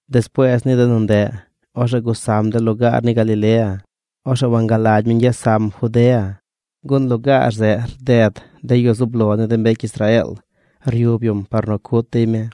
Despuees ni de nu ndeꞌ, orzeꞌ gusam de lugaar ni Galilea. Orzeꞌ wangalagy mi ñgyes sam Judea, gun lugaar zeꞌ rded de yu zub lo ni de mbecy Israeel ryub yum par nu cut dey mi.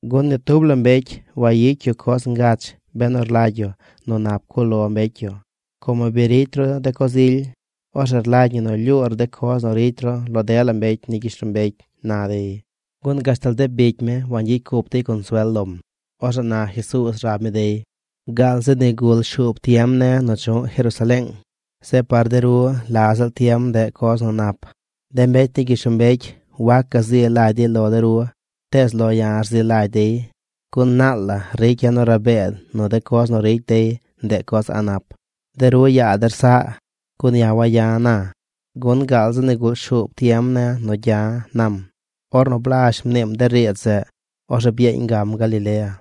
Gun ni tub la mbecy wayicy yu coz ngach benu rlagy yu nu nap cuꞌ lo mbecy yu. Como bi ricy ru de coz ily, orzeꞌ rlagy ñi nu lyuur de coz nu ricy ru lo dela mbecy ni gyishlombecy ―na dey. Gun gashtal de bicy mi wangyicy cup dey consuel lom. Orzeꞌ na Jesuuz rab mi dey: ―Gaal zi nigul shuub tiem ne̱ nu chu̱ꞌ Jerusaleeng. Zeꞌ par de ru la ziꞌl tiem ndeꞌ coz nu nap. De mbecy ni gyishlombecy wac gazi lagy dey lo de ru, tees lo ya̱ rzi lagy dey, gun naal la ricya̱ nu rabee nu de coz nu ricy dey, ndeꞌ coz a̱ꞌ nap. De ru yaa der saꞌ, gun ya̱ waya̱ na, gun gaal zi nigul shuub tiem ne̱ nu gya̱ ―nam. Ornu blazh mniim de riidz zeꞌ, orzeꞌ byeeñ gam Galilea.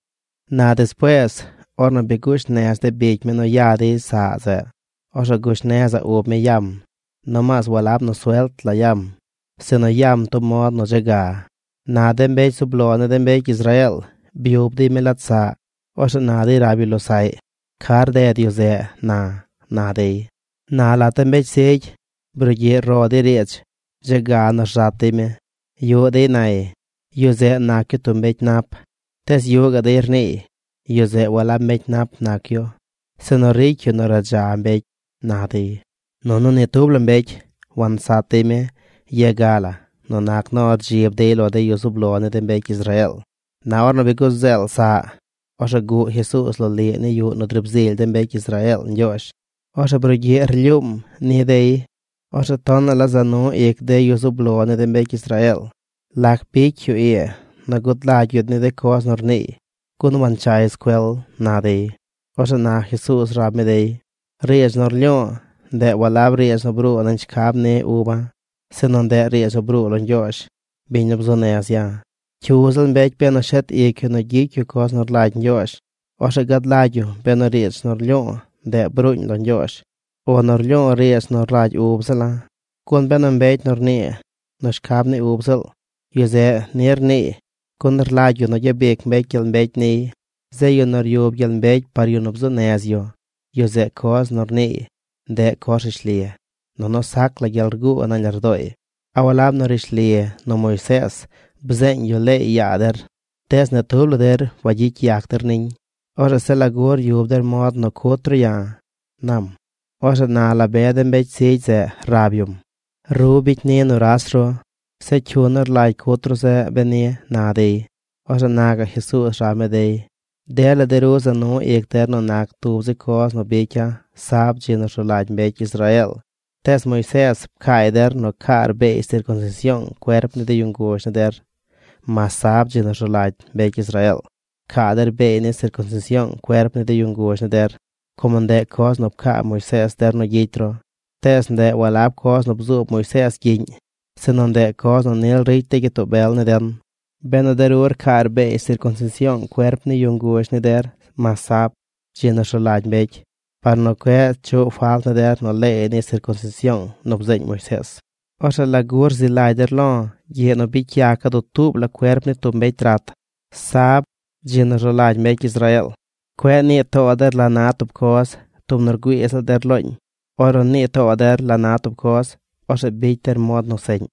Na despuees ornu bi gush nez de bicy mi nu ya dey saꞌ zeꞌ, orzeꞌ gush nezaꞌ ub mi yam. Nomaas walab nu suelt la yam, sinu yam tub mod nu dze ga. Na de mbecy zub lo ni de mbecy Israeel byub dey mi lat saꞌ. Orzeꞌ na dey rab yu losaꞌy: ―¿Ca rded yu zeꞌ na? ―na dey. Na lat de mbecy zigy brugyiꞌ ro dey riidz dze ga nu rzat dey mi. Yuꞌ dey nay: “Yu zeꞌ nac yu tub mbecy nap.” Tees yuꞌ gaꞌ dey rniiy: “Yu zeꞌ walab mbecy nap nac yu, sinu ricy yu nu radza mbecy”, na dey. Nunu ni tub la mbecy wansat dey mi ye ga la nu nac nu rdzib dey lo de yu zub lo ni de mbecy Israeel. Na ornu bi guzeel saꞌ, orzeꞌ guꞌ Jesuuz loliꞌ ni yuꞌ nu driib zily de mbecy Israeel Ñgyoozh. Orzeꞌ brugyiꞌ rlyuum ni dey. Orzeꞌ tonaꞌ la za nu ic de yu zub lo ni de mbecy Israeel: ―¿Lac bicy yu ii nu gud lagy yu ni de coz nu rniiy, gun wanchay scuel? ―na dey. Orzeꞌ na Jesuuz rab mi dey: ―Riidz nu rlyu̱u̱, ndeꞌ walab riidz nu bruu nañ shcab ni uba̱, sinu ndeꞌ riidz nu bruu lo Ñgyoozh, biñ nu bzuu nez ya̱. Cyu ziꞌl mbecy benu shet ic yu nu gyicy yu coz nu rlagy Ñgyoozh, orzeꞌ gad lagy yu benu riidz nu rlyu̱u̱, ndeꞌ bruuñ lo Ñgyoozh, o nu rlyu̱u̱ riidz nu rlagy ub ziꞌl la̱. Gun benu mbecy nu rnii nu shcab ni ub ziꞌl, yu zeꞌ ni rniiy gun rlagy yu nu gyabic mbecy gyel mbecy niy. Zeꞌ yu nu ryub gyel mbecy par yu nu bzuu nez yu, yu zeꞌ coz nu rniiy, ndeꞌ coz nu rishli, nunu sac la gyel rguu nañ lardooy. ’¿A walab nu rishli nu Moisees bzeeñ yu leey yaa der? Tees ni tub la der wagyicy yac der niñ. Orzeꞌ ¿zeꞌ lagu ryub der mod nu cut ru ya̱? ―nam. Orzeꞌ na la be de mbecy zigy zeꞌ rab yum: ―¡Ru bicy ni nuras ru! ¿Zeꞌ cyu nu rlagy cut ru zeꞌ beni? ―na dey. Orzeꞌ na gaꞌ Jesuuz rab mi dey: ―Dela de ru za nu ic der nu nac tub zi coz nu bicya̱ sab, dzi nu rzu lagy mbecy Israeel. Tees Moisees pcaay der nu caar beey sircunsision cuerp ni de yu nguzh ni der. Mas sab, dzi nu rzu lagy mbecy Israeel, rcaa der beey ni sircunsision cuerp ni yu nguzh ni der, como ndeꞌ coz nu pcaa Moisees der nu gyicy ru. Tees ndeꞌ walab coz nu bzuub Moisees gyiꞌñ, sinu ndeꞌ coz nu nil ricy de gyitoo bel ni den. Benu de ru rcaar beey sircunsision cuerp ni yu nguzh ni der mas sab, dzi nu rzu lagy mbecy, par nu cueꞌ chuꞌ falt ni der nu leey ni sircunsision nu bzeeñ Moisees, orzeꞌ ¿lagu rzi lagy der lo̱ gyiꞌ nu bicy yaca̱ dutuub la cuerp ni tub mbecy rat, sab, dzi nu rzu lagy mbecy Israeel? Cueꞌ nii too der la na tub coz tub nu rgüii ziꞌl der looñ. Ornu nii too der la na tub coz, orzeꞌ bicy der mod nu seꞌñ.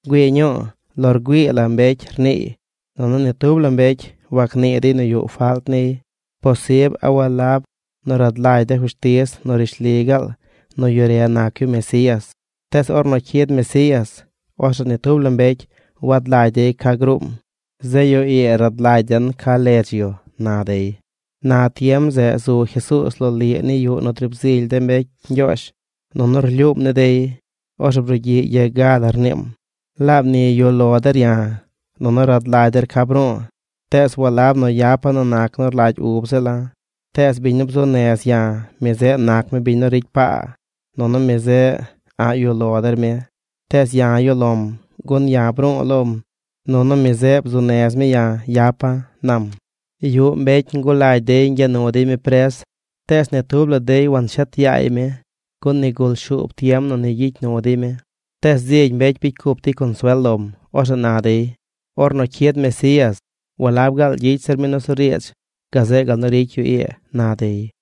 ¡Güii ñuu! Lo rgüii la mbecy rniiy. Nunu ni tub la mbecy wagnii dey nu yuꞌ falt niy. ¿Posib a walab nu rad lagy de fushtiz nu rishli gaal nu yu re nac yu Mesías? Tees ornu cyid Mesías, orzeꞌ ni tub la mbecy wad lagy dey ca gruum. Zeꞌ yu ii rad lagy den ca ledz yu ―na dey. Na tiem zeꞌ zu Jesuuz loliꞌ ni yuꞌ nu driib zily de mbecy Ñgyoozh, nunu rlyuum ni dey. Orzeꞌ brugyiꞌ ye ga la rniim: ―¡Laab ni yuꞌ lo der ya̱, nunu rad lagy der ca bru̱u̱! Tees walab nu yapa̱ nu nac nu rlagy ub ziꞌl la̱, tees biñ nu bzuu nez ya̱, mi zeꞌ nac mi biñ nu ricy paa, nunu mi zeꞌ a̱ꞌ yuꞌ lo der mi. Tees ya̱ yuꞌ lo̱m, gun ya̱ bru̱u̱ lom, nunu mi zeꞌ bzuu nez mi ya̱ yapa̱ ―nam. Yuꞌ mbecy ngulagy dey ñgya nu dey mi pres, tees ni tub la dey wanshet yaay mi gun nigul shuub tiem nu ni gyicy nu dey mi. Tees zigy mbecy bicy cup dey consuel lom. Orzeꞌ na dey: ―Ornu cyid Mesías, ¿walab gaal gyicy zir mi nusuriidz, gazeꞌ gal nu ricy yu ii? ―na dey.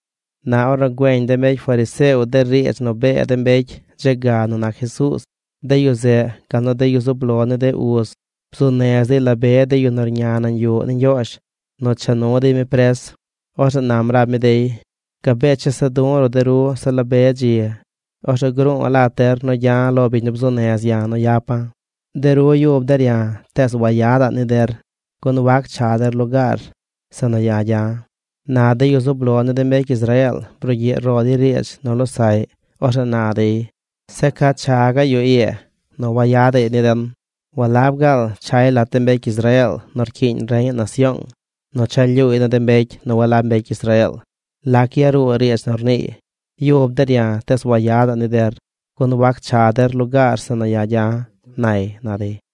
Na ornu güeñ de mbecy fariseo de riidz nu bee de mbecy dze ga nu nac Jesuuz, de yu zeꞌ gal nu de yu zub lo ni de uz bzuu nez dey la be de yu nu rña nañ yuꞌ ni Ñgyoozh nu cha nu dey mi pres. Orzeꞌ nam rab mi dey: ―Gabee chesa du̱ de ru se la be dzi. Orzeꞌ gru̱u̱ lat der nu gya̱ lo biñ nu bzuu nez ya̱ nu yapa̱. De ru yub der ya̱, tees wayada̱ꞌ ni der, gun wac cha der lugaar zeꞌ nu ya̱ gya̱. Na de yu zub lo ni de mbecy Israeel brugyiꞌ ro dey riidz nu losaꞌy. Orzeꞌ na dey: ―¿Zeꞌ ca cha gaꞌ yu ii nu wayadaꞌy ni den? ¿Walab gaal chay lat de mbecy Israeel nu rcyiiñ reñaꞌ nasyoong nu cha lyuuy ni de mbecy nu walab mbecy Israeel? ¿Lac yaruu de riidz nu rniiy: “Yub der ya̱, tees wayada̱ ni der, gun wac cha der lugaar zeꞌ nu ya̱ gya̱”, nay? ―na dey.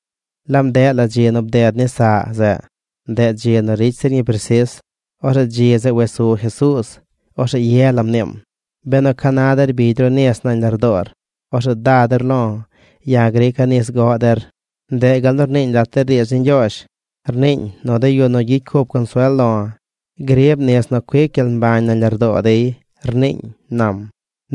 Laab ndeꞌ la dzi nu bded ni saꞌ zeꞌ; ndeꞌ dzi nu ricy zir ñi presis. Orzeꞌ dzi zeꞌ wes su Jesuuz. Orzeꞌ ye la mniim: ―Benu ca na der rbigy ru nis nañ lardoor, orzeꞌ da der lo̱. Ya̱ grica̱ nis goꞌ der. Ndeꞌ gal nu rniiñ lat de riidz ni Ñgyoozh. Rniiñ nu de yu nu gyicy cup consuel lo̱, grib nis nu cuic gyel mbañ nañ lardoo dey, rniiñ ―nam.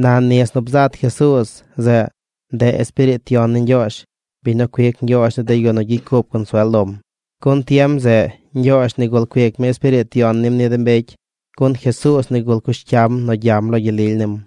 Na nis nu bzat Jesuuz zeꞌ, ndeꞌ Espiriit Yon ni Ñgyoozh, biñ nu cuic Ñgyoozh ni de yu nu gyicy cup consuel lom, gun tiem zeꞌ Ñgyoozh nigul cuic mi Espiriit Yon nim ni mbecy, gun Jesuuz nigul cush cyam nu gyam lo gyel lily nim.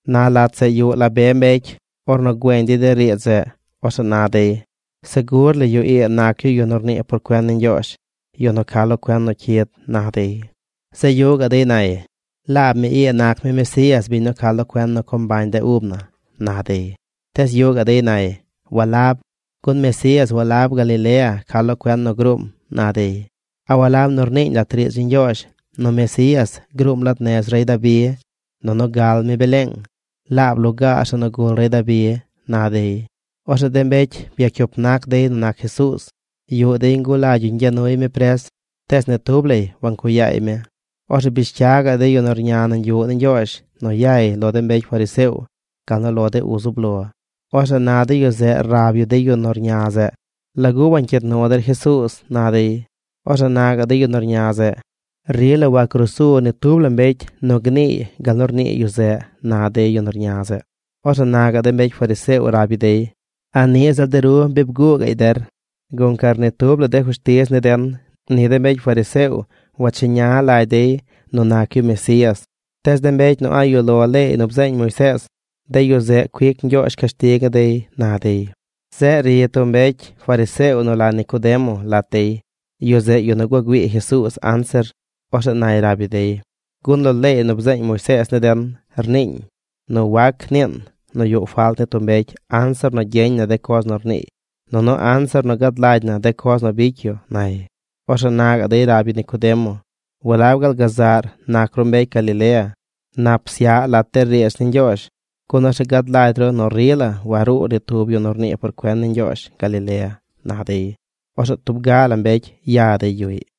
Na lat zeꞌ yuꞌ la be mbecy. Ornu güeñ dey de riidz zeꞌ, orzeꞌ na dey: ―Segur la yu ii nac yu yu nu mnii por cuen ni Ñgyoozh, yu nu ca lo cuen nu cyid ―na dey. Zeꞌ yuꞌ gaꞌ dey nay: ―Laab mi ii nac mi Mesías, biñ nu ca lo cuen nu co mbañ de ub na ―na dey. Tees yuꞌ gaꞌ dey nay: ―Walab, gun Mesías walab Galilea ca lo cuen nu gruum ―na dey―. ¿A walab nu rniiñ lat de riidz ni Ñgyoozh nu Mesías gruum lat de nez rey Dabi, nunu gal mi Beleeng, laab lugaar zeꞌ nu gul rey Dabi? ―na dey. Orzeꞌ de mbecy byacyup nac dey nu nac Jesuuz. Yuꞌ dey ngulagy yu ñgya nuy mi pres, tees ni tub lay wancuꞌ yaay mi. Orzeꞌ bish cya de yu nu rña nañ yuꞌ ni Ñgyoozh nu yay lo de mbecy fariseo, gal nu lo de uz zub lo. Orzeꞌ na de yu zeꞌ rab yu de yu nu rña zeꞌ: ―¿Lagu wancyiid nu der Jesuuz? ―na dey. Orzeꞌ na gaꞌ de yu nu rña zeꞌ: ―¡Rila wagrusu ni tub la mbecy nu gniiy gal nu rnii yu zeꞌ! ―na de yu nu rña zeꞌ. Orzeꞌ na gaꞌ de mbecy fariseo rab yu dey: ―¿A niꞌ ziꞌl de ru bi bguu gaꞌy der? Guncar ni tub la de fushtiz ni den, ni de mbecy fariseo wacheña lagy dey nu nac yu Mesías. Tees de mbecy nu a̱ꞌ yuꞌ lo leey nu bzeeñ Moisees, de yu zeꞌ cuic Ñgyoozh cashtig ni dey ―na dey. Zeꞌ ri tub mbecy fariseo nu la Nicodemo lat dey. Yu zeꞌ yu nu gua güii Jesuuz anzir. Orzeꞌ nay rab yu dey: ―Gun lo leey nu bzeeñ Moisees ni den rniiñ nu wac niin nu yuꞌ falt ni tub mbecy anzir nu gyeñ na de coz nu rniiy, nunu anzir nu gad lagy na de coz nu bicy yu ―nay. Orzeꞌ na gaꞌ dey rab yu Nicodemo: ―¿Walab gaal gazaꞌr nac ru mbecy Galilea? Nap psyaꞌ lat de riidz ni Ñgyoozh, gun orzeꞌ gad lagy ru nu rila waruu ni tub yu nu rnii por cuen ni Ñgyoozh Galilea ―na dey. Orzeꞌ tub ga la mbecy ya dey yuꞌy.